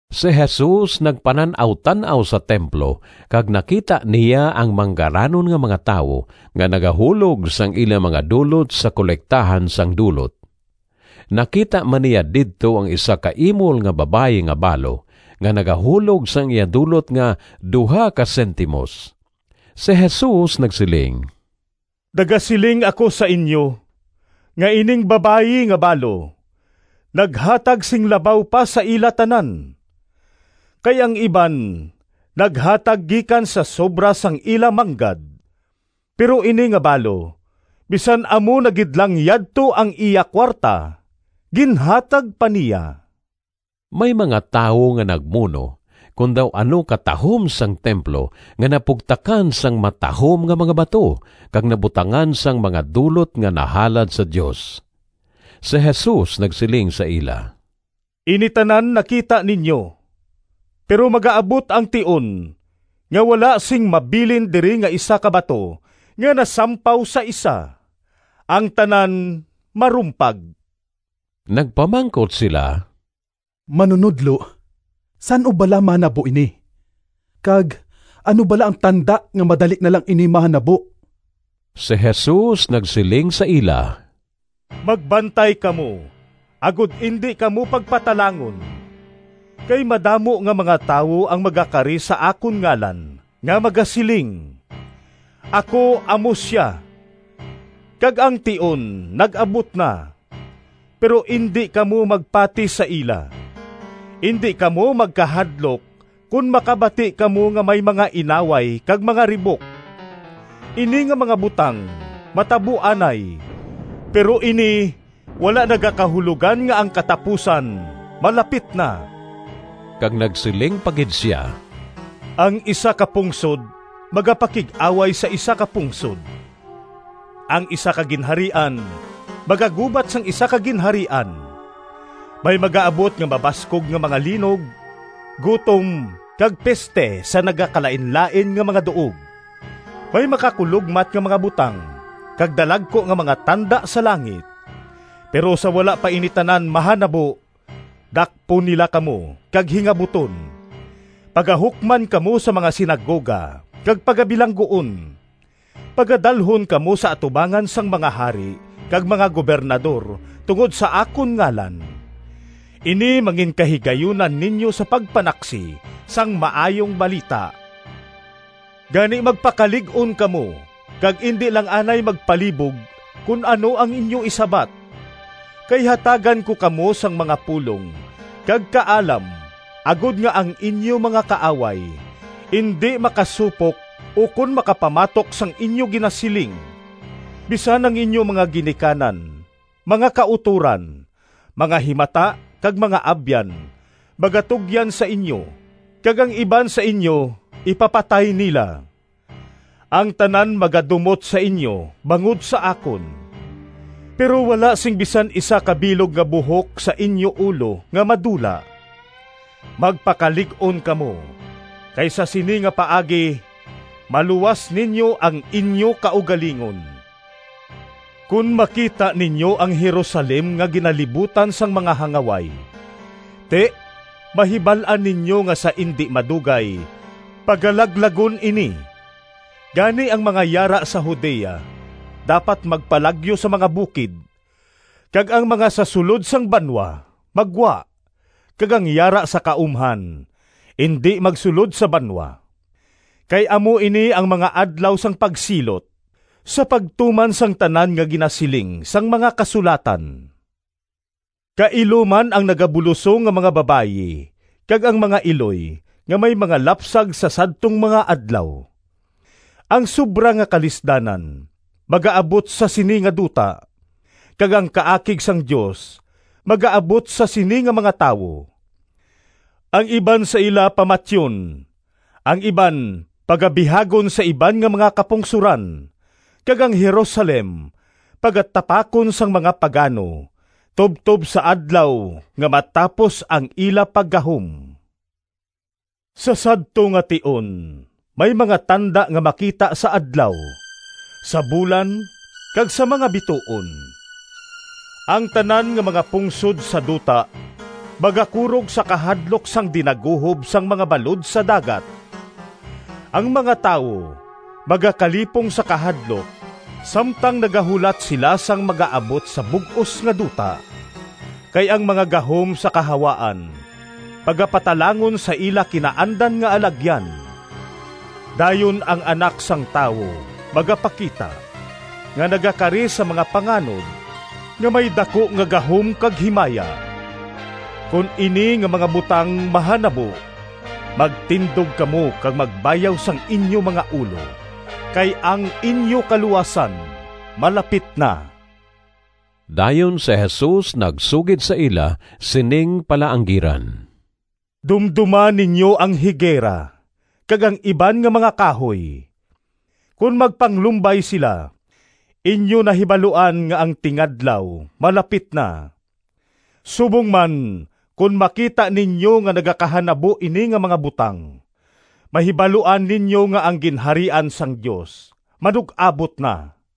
Si Jesus nagpanan-awtan-aw sa templo kag nakita niya ang manggaranon nga mga tawo nga nagahulog sang ila mga dulot sa kolektahan sang dulot. Nakita man niya didto ang isa ka imol nga babayi nga balo nga nagahulog sang iya dulot nga duha ka sentimos. Si Jesus nagsiling, “Nagasiling ako sa inyo nga ining babayi nga balo naghatag sing labaw pa sa ila tanan. Kay ang iban naghatag gikan sa sobra sang ila manggad, pero ini nga balo bisan amo na gid lang yadto ang iya kuwarta, ginhatag pa niya.” May mga tawo nga nagmuno kon daw ano katahom sang templo nga napugtakan sang matahom nga mga bato kag nabutangan sang mga dulot nga nahalad sa Dios. Si Jesus nagsiling sa ila, “Ini tanan nakita ninyo, pero magaabot ang tion nga wala sing mabilin diri nga isa ka bato nga nasampaw sa isa. Ang tanan marumpag.” Nagpamangkot sila, “Manunodlo, san-o bala mahanabo ini? Kag ano bala ang tanda nga madali na lang ini mahanabo?” Si Jesus nagsiling sa ila, “Magbantay kamo agod indi kamo pagpatalangon. Kay madamo nga mga tawo ang magakari sa akon ngalan nga magasiling, ‘Ako amo sia!’ kag, ‘Ang tion nag-abot na!’ Pero indi kamo magpati sa ila. Indi kamo magkahadlok kon makabati kamo nga may mga inaway kag mga ribok. Ini nga mga butang matabo anay, pero ini wala nagakahulogan nga ang katapusan malapit na.” Kag nagsiling pa gid sia, “Ang isa ka pungsod magapakig-away sa isa ka pungsod, ang isa ka ginharian magagubat sang isa ka ginharian. May magaabot nga mabaskog nga mga linog, gutom, kag piste sa nagakalainlain nga mga duog. May makakulogmat nga mga butang kag dalagku nga mga tanda sa langit. Pero sa wala pa ini tanan mahanabo, dakpon nila kamo kag hingabuton. Pagahukman kamo sa mga sinagoga kag pagabilangguon. Pagadalhon kamo sa atubangan sang mga hari kag mga gobernador tungod sa akon ngalan. Ini manginkahigayunan ninyo sa pagpanaksi sang Maayong Balita. Gani magpakalig-on kamo kag indi lang anay magpalibog kon ano ang inyo isabat, kay hatagan ko kamo sang mga pulong kag kaalam agod nga ang inyo mga kaaway indi makasupok ukon makapamatok sang inyo ginasiling. Bisan ang inyo mga ginikanan, mga kautoran, mga himata kag mga abyan magatugyan sa inyo kag ang iban sa inyo ipapatay nila. Ang tanan magadumot sa inyo bangod sa akon. Pero wala sing bisan isa ka bilog nga buhok sa inyo ulo nga madula. Magpakalig-on kamo, kay sa sini nga paagi maluwas ninyo ang inyo kaugalingon.” “Kon makita ninyo ang Jerusalem nga ginalibutan sang mga hangaway, ti, mahibal-an ninyo nga sa indi madugay pagalaglagon ini. Gani ang mga yara sa Judea dapat magpalagyo sa mga bukid, kag ang mga sa sulod sang banwa maggwa, kag ang yara sa kaumhan indi magsulod sa banwa. Kay amo ini ang ‘Mga Adlaw sang Pagsilot,’ sa pagtuman sang tanan nga ginasiling sang mga Kasulatan. Kailo man ang nagabulosong nga mga babayi kag ang mga iloy nga may mga lapsag sa sadtong mga adlaw. Ang sobra nga kalisdanan magaabot sa sini nga duta, kag ang kaakig sang Dios magaabot sa sini nga mga tawo. Ang iban sa ila pamatyon, ang iban pagabihagon sa iban nga mga kapungsoran, kag ang Jerusalem pagatapakon sang mga pagano tubtob sa adlaw nga matapos ang ila paggahom.” “Sa sadto nga tion may mga tanda nga makita sa adlaw, sa bulan kag sa mga bituon. Ang tanan nga mga pungsod sa duta magakurog sa kahadlok sang dinaguhob sang mga balod sa dagat. Ang mga tawo magakalipong sa kahadlok samtang nagahulat sila sang magaabot sa bug-os nga duta. Kay ang mga gahom sa kahawaan pagapatalangon sa ila kinaandan nga alagyan. Dayon ang Anak sang Tawo magapakita, nga nagakari sa mga panganod, nga may daku nga gahom kag himaya. Kon ini nga mga butang mahanabo, magtindog kamo kag magbayaw sang inyo mga ulo, kay ang inyo kaluwasan malapit na.” Dayon si Jesus nagsugid sa ila sining palaanggiran, “Dumdoma ninyo ang higera kag ang iban nga mga kahoy. Kon magpanglumbay sila, inyo nahibaluan nga ang tingadlaw malapit na. Subong man, kon makita ninyo nga nagakahanabo ini nga mga butang, mahibaluan ninyo nga ang Ginharian sang Dios manug-abot na.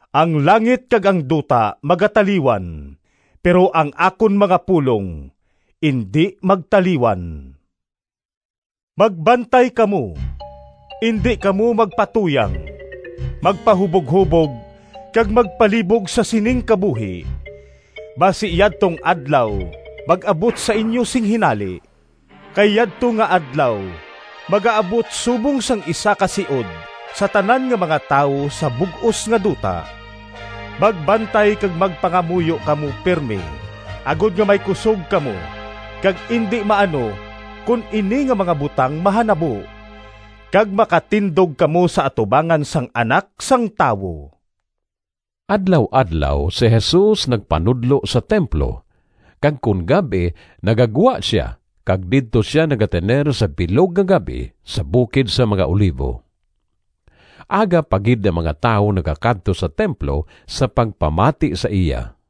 Ang langit kag ang duta magataliwan, pero ang akon mga pulong indi magtaliwan.” “Magbantay kamo! Indi kamo magpatuyang, magpahuboghubog kag magpalibog sa sining kabuhi, basi yadtong Adlaw mag-abot sa inyo sing hinali. Kay yadto nga Adlaw magaabot subong sang isa ka siod sa tanan nga mga tawo sa bug-os nga duta. Magbantay kag magpangamuyo kamo pirme agod nga may kusog kamo kag indi maano kon ini nga mga butang mahanabo, kag makatindog kamo sa atubangan sang Anak sang Tawo.” Adlaw-adlaw si Jesus nagpanudlo sa templo, kag kon gab-i nagagwa sia kag didto sia nagatener sa bilog nga gab-i sa bukid sang mga Olivo. Aga pa gid ang mga tawo nagakadto sa templo sa pagpamati sa iya.